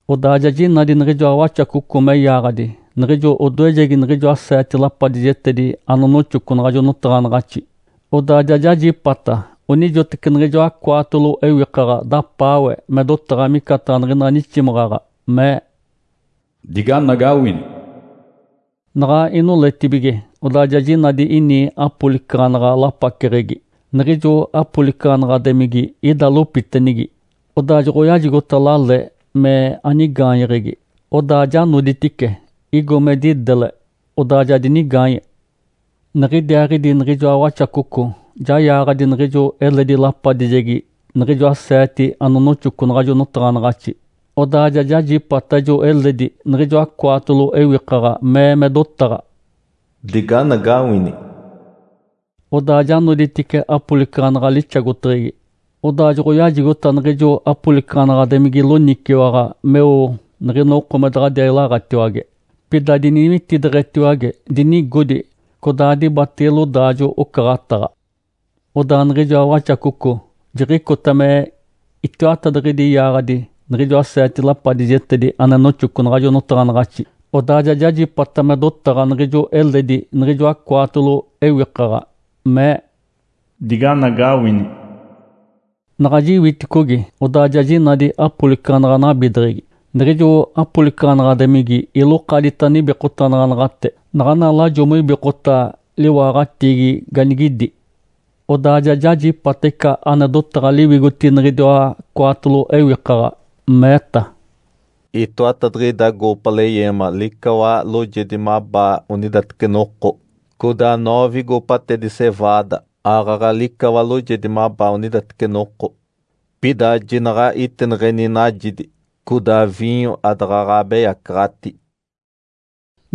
Odaa ja jinadi niɡ̶ijoa Waxacoco me yaaɡ̶adi niɡ̶ijo odoejegi niɡ̶ijoa seete lapadijetedi anonoxoco naɡ̶ajo notaɡ̶anaɡ̶axi. Odaa ja jajipata onijoteci niɡ̶ijoa cwaatolo ewikaɡ̶a dapaawe me dotaɡ̶a micataɡ̶a niɡ̶ina niximaɡ̶aɡ̶a, mee, “Diganagawini!” Naɡ̶a inoletibige, odaa ja jinadi ini apolicaɡ̶anaɡ̶a lapaceɡ̶egi. Niɡ̶ijo apolicaɡ̶anaɡ̶ademigi ida lopitenigi. Odaa joɡ̶oyajigota lale me anigaanyeɡ̶egi. Odaa ja noditice, igo me didele, odaa ja dinigaanye. Niɡ̶idiaaɡ̶idi niɡ̶ijoa Waxacoco ja yaaɡ̶adi niɡ̶ijo eledi lapadijegi niɡ̶ijoa seete anonoxoco naɡ̶ajo notaɡ̶anaɡ̶axi. Odaa ja jajipata ijo eledi niɡ̶ijoa cwaatolo ewikaɡ̶a mee me dotaɡ̶a, “Diganagawini!” Odaa ja noditice apolicaɡ̶anaɡ̶a lixagoteɡ̶egi. Odaa joɡ̶oyajigota niɡ̶ijo apolicaɡ̶anaɡ̶ademigi loniciwaɡ̶a meo niɡ̶ina oko me daɡ̶adiaa ilaɡ̶atiwage, pida diniwitideɡ̶etiwage, dinigodi. Codaa dibatege lodaajo-ocaɡ̶ataɡ̶a. Odaa niɡ̶ijoa Waxacoco jiɡ̶icota me itiwatadiɡ̶idi yaaɡ̶adi niɡ̶ijoa seete lapadijetedi ane noxoco naɡ̶ajo notaɡ̶anaɡ̶axi. Odaa ja jajipata me dotaɡ̶a niɡ̶ijo eledi niɡ̶ijoa cwaatolo ewikaɡ̶a, mee, “Diganagawini!” Naɡ̶a jiwiticogi, odaa ja jinadi apolicaɡ̶anaɡ̶a nabideɡ̶egi. Niɡ̶ijo apolicaɡ̶anaɡ̶ademigi ilokadita nibikotanaɡ̶anaɡ̶ate (naɡ̶ana lajo moibikota liwaaɡ̶atiigi ganigidi). Odaa ja jajipata ica ane dotaɡ̶a liwigotigi niɡ̶idiwa cwaatolo ewikaɡ̶a, meeta, “Itoatadiɡ̶ida goopa leyeema licawa loojedi mabaa onidateci noko, codaa noove goopatedi ‘cevaada’ aaɡ̶aɡ̶a licawa loojedi mabaa onidateci noko. Pida jinaɡ̶a itineɡ̶eni najidi, codaa viinyo adaɡ̶aɡ̶a abeyacaɡ̶ati!”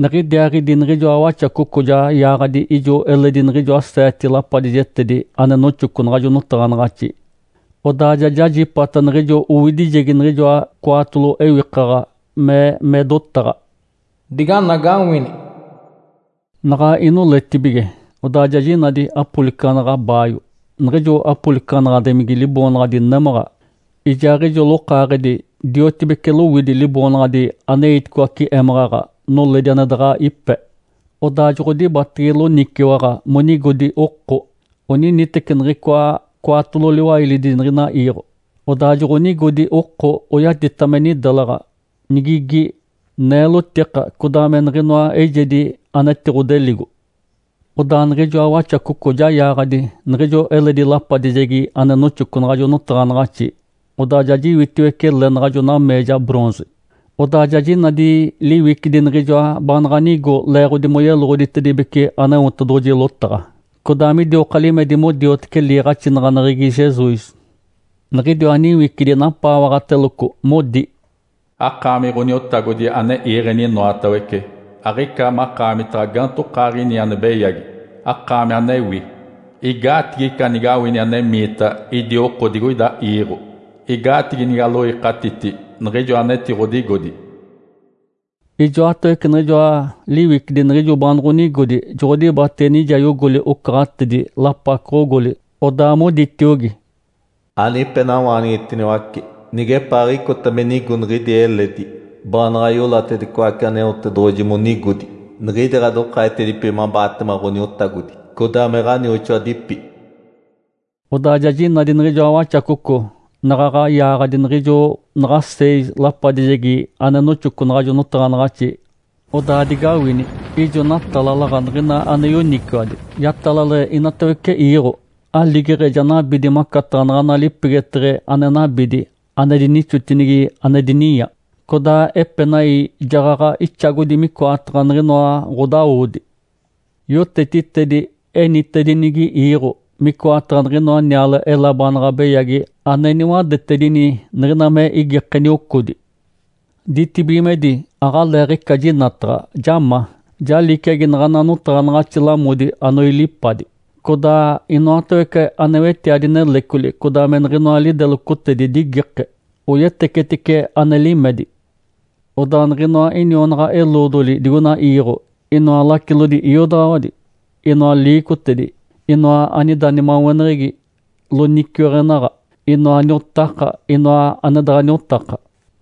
Niɡ̶idiaaɡ̶idi niɡ̶ijoa Waxacoco ja yaaɡ̶adi ijo eledi niɡ̶ijoa seete lapadijetedi ane noxoco naɡ̶ajo notaɡ̶anaɡ̶axi. Odaa ja jajipata niɡ̶ijo owidijegi niɡ̶ijoa cwaatolo ewikaɡ̶a mee me dotaɡ̶a, “Diganagawini!” Naɡ̶a inoletibige, odaa ja jinadi apolicaɡ̶anaɡ̶a baayo. Niɡ̶ijo apolicaɡ̶anaɡ̶ademigi liboonaɡ̶adi “Némaɡ̶a”, ijaaɡ̶ijo ijo lokaaɡ̶edi diotibeci lowidi liboonaɡ̶adi “Aneiticoace émaɡ̶aɡ̶a, noledi ane daɡ̶a ipe”. Odaa joɡ̶odibatege loniciwaɡ̶a monigodi oko, oniniteci niɡ̶icoa cwaatolo liwailidi niɡ̶ina iiɡ̶o. Odaa joɡ̶onigodi oko, oyatita me nidelaɡ̶a, nigigi, neelotika, codaa me niɡ̶inoa eijedi anetiɡ̶odeligo. Odaa niɡ̶ijoa Waxacoco ja yaaɡ̶adi niɡ̶ijo eledi lapadijegi ane noxoco naɡ̶ajo notaɡ̶anaɡ̶axi. Odaa ja jiwitiwece le naɡ̶ajo nameeja “bronze”, odaa ja jinadi liwicidi niɡ̶ijoa baanaɡ̶a nigo leeɡ̶odi moyeloɡ̶oditedibece Aneotedoɡ̶oji lotaɡ̶a, codaa midioka limedi modiotece liiɡ̶axinaɡ̶aneɡ̶egi Jesus. Niɡ̶idiwa niwicidi napaawaɡ̶ateloco, modi, “Akaami Ǥoniotagodi ane iiɡ̶eni inoatawece, aɡ̶ica makaamitaɡ̶a gaantokaaɡ̶ini ane beyagi, akaami anewi. Igaatigi ica nigawini anemiita idi oko digoida iiɡ̶o? Igaatigi nigaloikatiti niɡ̶ijo anetiɡ̶odigodi?” Ijoatawece niɡ̶ijoa liwicidi niɡ̶ijo baanoɡ̶onigodi joɡ̶odibatege nijayogoli ocaɡ̶atedi, lapacoɡ̶ogoli. Odaa moditiogi, “Anipenawaanigitiniwace nigepaaɡ̶icota me nigo niɡ̶idi eledi, baanaɡ̶a iolatedicoace Aneotedoɡ̶oji monigodi, niɡ̶idi ɡ̶adokaaɡ̶etedipi mabaatema Ǥoniotagodi, codaa me ɡ̶anioxoadipi.” Odaa ja jinadi niɡ̶ijoa Waxacoco naɡ̶aɡ̶a yaaɡ̶adi niɡ̶ijo naɡ̶a seis lapadijegi ane noxoco naɡ̶ajo notaɡ̶anaɡ̶axi. Odaa digawini! Ijo natalalaɡ̶a niɡ̶ina ane yoniciwadi, yatalale inatawece iiɡ̶o. Aligeɡ̶e ja nabidi macataɡ̶a naɡ̶ana lipegeteɡ̶e ane nabidi ane dinixotinigi ane dininya, codaa epenai jaɡ̶aɡ̶a ixagodi micoataɡ̶a niɡ̶inoa ɡ̶odawodi. Yotetitedi enitedinigi iiɡ̶o, micoataɡ̶a niɡ̶inoa niale-ela baanaɡ̶a beyagi ane niwadetedini niɡ̶ina me igike niocodi. Ditibigimedi aɡ̶aleeɡ̶ica jinataɡ̶a, ja ma, ja liciagi naɡ̶ana notaɡ̶anaɡ̶axi lamodi anoilipadi. Codaa inoatawece ane wetiadi nelecoli, codaa me niɡ̶inoa lidelocotedi digike, oyetecetice ane limedi. Odaa niɡ̶inoa inionaɡ̶a-eloodoli digoina iiɡ̶o, inoa lacilodi iodaɡ̶awadi, inoa liicotedi, inoa anida nimaweneɡ̶egi loniciweɡ̶enaɡ̶a, inoa niotaka, inoa ane daɡ̶a niotaka,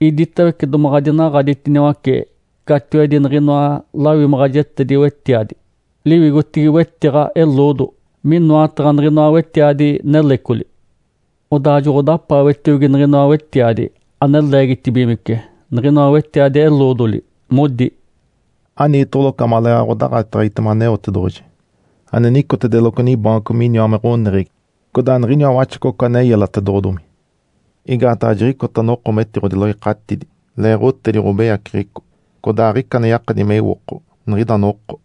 iditawece domaɡ̶a dinaɡ̶aditiniwace catiwedi niɡ̶inoa lawimaɡ̶ajetedi-wetiadi liwigotigi wetiɡ̶a eloodo minoataɡ̶a niɡ̶inoa wetiadi nelecoli. Odaa joɡ̶odapaawetiogi niɡ̶inoa wetiadi ane leegitibigimece niɡ̶inoa wetiadi eloodoli, modi, “Aniitoɡ̶oloco amaleeɡ̶aɡ̶a ɡ̶odaɡ̶ateɡ̶egitema Aneotedoɡ̶oji ane nicotedeloco nibaanco miniwa me ɡ̶oneɡ̶egi, codaa niɡ̶iniwa Waxacoco ane yelatedoɡ̶odomi. Igaataɡ̶a jiɡ̶icota noko metiɡ̶odiloikatidi leeɡ̶otedi ɡ̶obeyaceɡ̶eco, codaa aɡ̶ica ane yakadi me iwoko niɡ̶ida noko.”